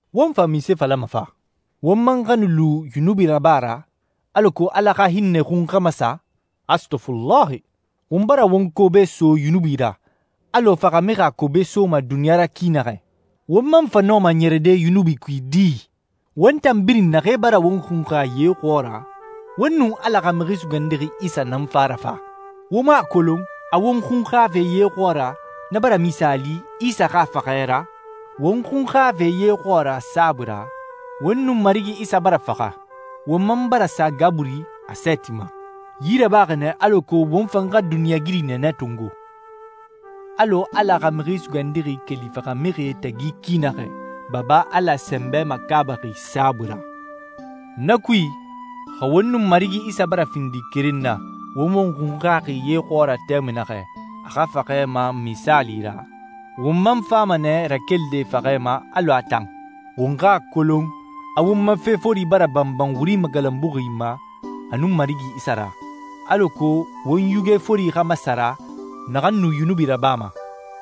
Won fa munse falama fa? Won man xa nu lu yunubi raba ra, alako Ala xa hinnɛ xun xa masa? Astɔfulahi! Won bara won kobe so yunubi ra alɔ faxamixi a kobe soma duniɲa ra ki naxɛ. Won man fa nɔma ɲɛrɛde yunubi kui di? Won tan birin naxee bara won xunxa ye xɔɔra, won nun Ala xa Mixi Sugandixi Isa nan fa a ra fa. Wo mu a kolon a won xunxafe ye xɔɔra na bara misaali Isa xa faxɛ ra? Won xunxafe ye xɔɔra saabui ra, won nun Marigi Isa bara faxa, won man bara sa gaburi a sɛɛti ma. Yi rabaxi nɛ alako won fan xa duniɲɛigiri nɛɛnɛ tongo, alɔ Ala xa Mixi Sugandixi keli faxamixie tagi ki naxɛ Baba Ala sɛnbɛ makaabaxi saabui ra. Na kui, xa won nun Marigi Isa bara findi keren na won won xunxaxi ye xɔɔra tɛmui naxɛ a xa faxɛ ma misaali ra, won man fama nɛ rakelide faxɛ ma alɔ a tan. Won xa a kolon a won ma fe fori bara banban wuri magalanbuxi ma a nun Marigi Isa ra, alako won yuge fori xa masara naxan nu yunubi rabama,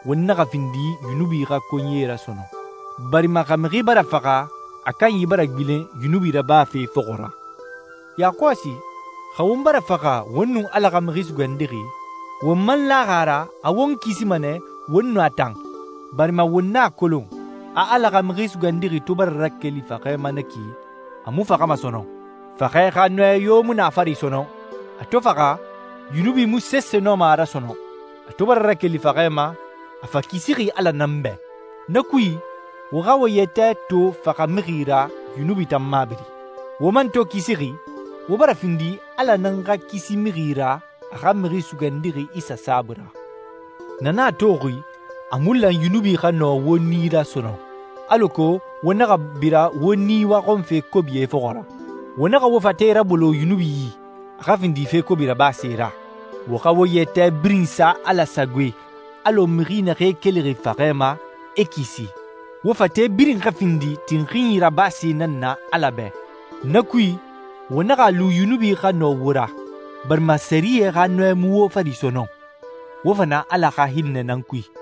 won naxa findi yunubi xa konyie ra sɔnɔn. Barima xa mixi bara faxa, a kanyi bara gbilen yunubi rabafe fɔxɔ ra. Yakɔsi, xa won bara faxa won nun Ala xa Mixi Sugandixi, won man laxi a ra a won kisima nɛ won nun a tan, barima won a kolon a Ala xa Mixi Sugandixi to bara rakeli faxɛ ma na ki a mu faxama sɔnɔn. Faxɛ xa nɔɛ yo mu na a fari sɔnɔn. A to faxa, yunubi mu sese nɔma a ra sɔnɔn. A to bara rakeli faxɛ ma, a fa kisixi Ala nan bɛ. Na kui, wo xa wo yɛtɛ to faxamixi ra yunubi tan mabiri. Wo man to kisixi, wo bara findi Ala nan xa kisi mixi ra a xa Mixi Sugandixi Isa saabui ra. Na nan a toxi a mu lan yunubi xa nɔ wo nii ra sɔnɔn, alako wo naxa bira wo nii waxɔnfe kobie fɔxɔ ra. Wo naxa wo fate rabolo yunubi yi, a xa findi fe kobi rabase ra. Wo xa wo yɛtɛ birin sa Ala sagoe alɔ mixi naxee kelixi faxɛ ma, e kisi. Wo fate birin xa findi tinxinyi rabase nan na Ala bɛ Na kui, wo naxa a lu yunubi xa nɔ wo ra, barima sɛriyɛ xa nɔɛ mu wo fari sɔnɔn. Wo fa na Ala xa hinnɛ nan kui.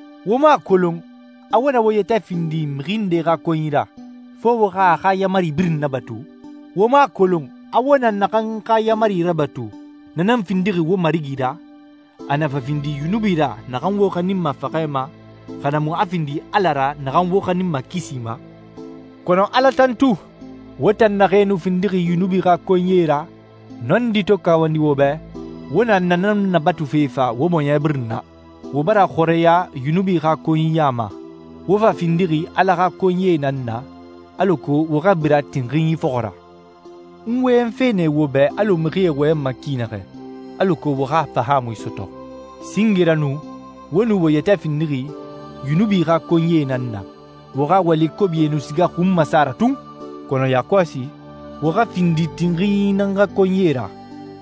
Wo mu a kolon a wo na wo yɛtɛ findi mixi nde xa konyi ra, fo wo xa a xa yaamari birin nabatu? Wo mu a kolon a wo na naxan xa yaamari rabatu, na nan findixi wo marigi ra, a na fa findi yunubi ra naxan wo xaninma faxɛ ma, xa na mu a findi Ala ra naxan wo xaninma kisi ma? Kɔnɔ Ala tantu! Wo tan naxee nu findixi yunubi xa konyie ra, nɔndi to kawandi wo bɛ, wo na nan nabatufe fa wo bɔɲɛ birin na. Wo bara xɔrɛya yunubi xa konyiya ma, wo fa findixi Ala xa konyie nan na, alako wo xa bira tinxinyi fɔxɔ ra. N wɔyɛnfe nɛ wo bɛ alɔ mixie wɔyɛnma ki naxɛ, alako wo xa fahaamui sɔtɔ. Singe ra nu, wo nu wo yɛtɛ findixi yunubi xa konyie nan na, wo xa wali kobie nu siga xun masa ra tun. Kɔnɔ yakɔsi, wo xa findi tinxinyi nan xa konyie ra,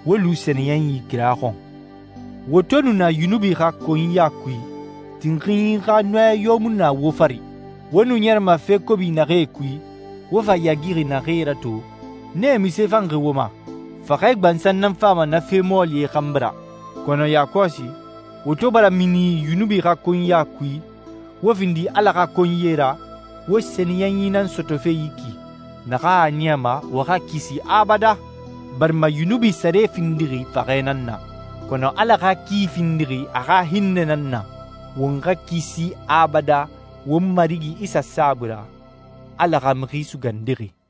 wo lu sɛniyɛnyi kira xɔn. Wo to nu na yunubi xa konyiya kui, tinxinyi xa nɔɛ yo mu nu na wo fari. Wo nu ɲɛrɛma fe kobi naxee kui, wo fa yaagixi naxee ra to, nee munse fanxi wo ma? Faxɛ gbansan nan fama na fe mɔɔlie xanbi ra. Kɔnɔ yakɔsi, wo to bara mini yunubi xa konyiya kui, wo findi Ala xa konyie ra, wo sɛniyɛnyi nan sɔtɔfe yi ki naxan a niyama wo xa kisi abadan. Barima yunubi sare findixi faxɛ nan na, kɔnɔ Ala xa ki findixi a xa hinnɛ nan na: Won xa kisi abadan won Marigi Isa saabui ra, Ala xa Mixi Sugandixi.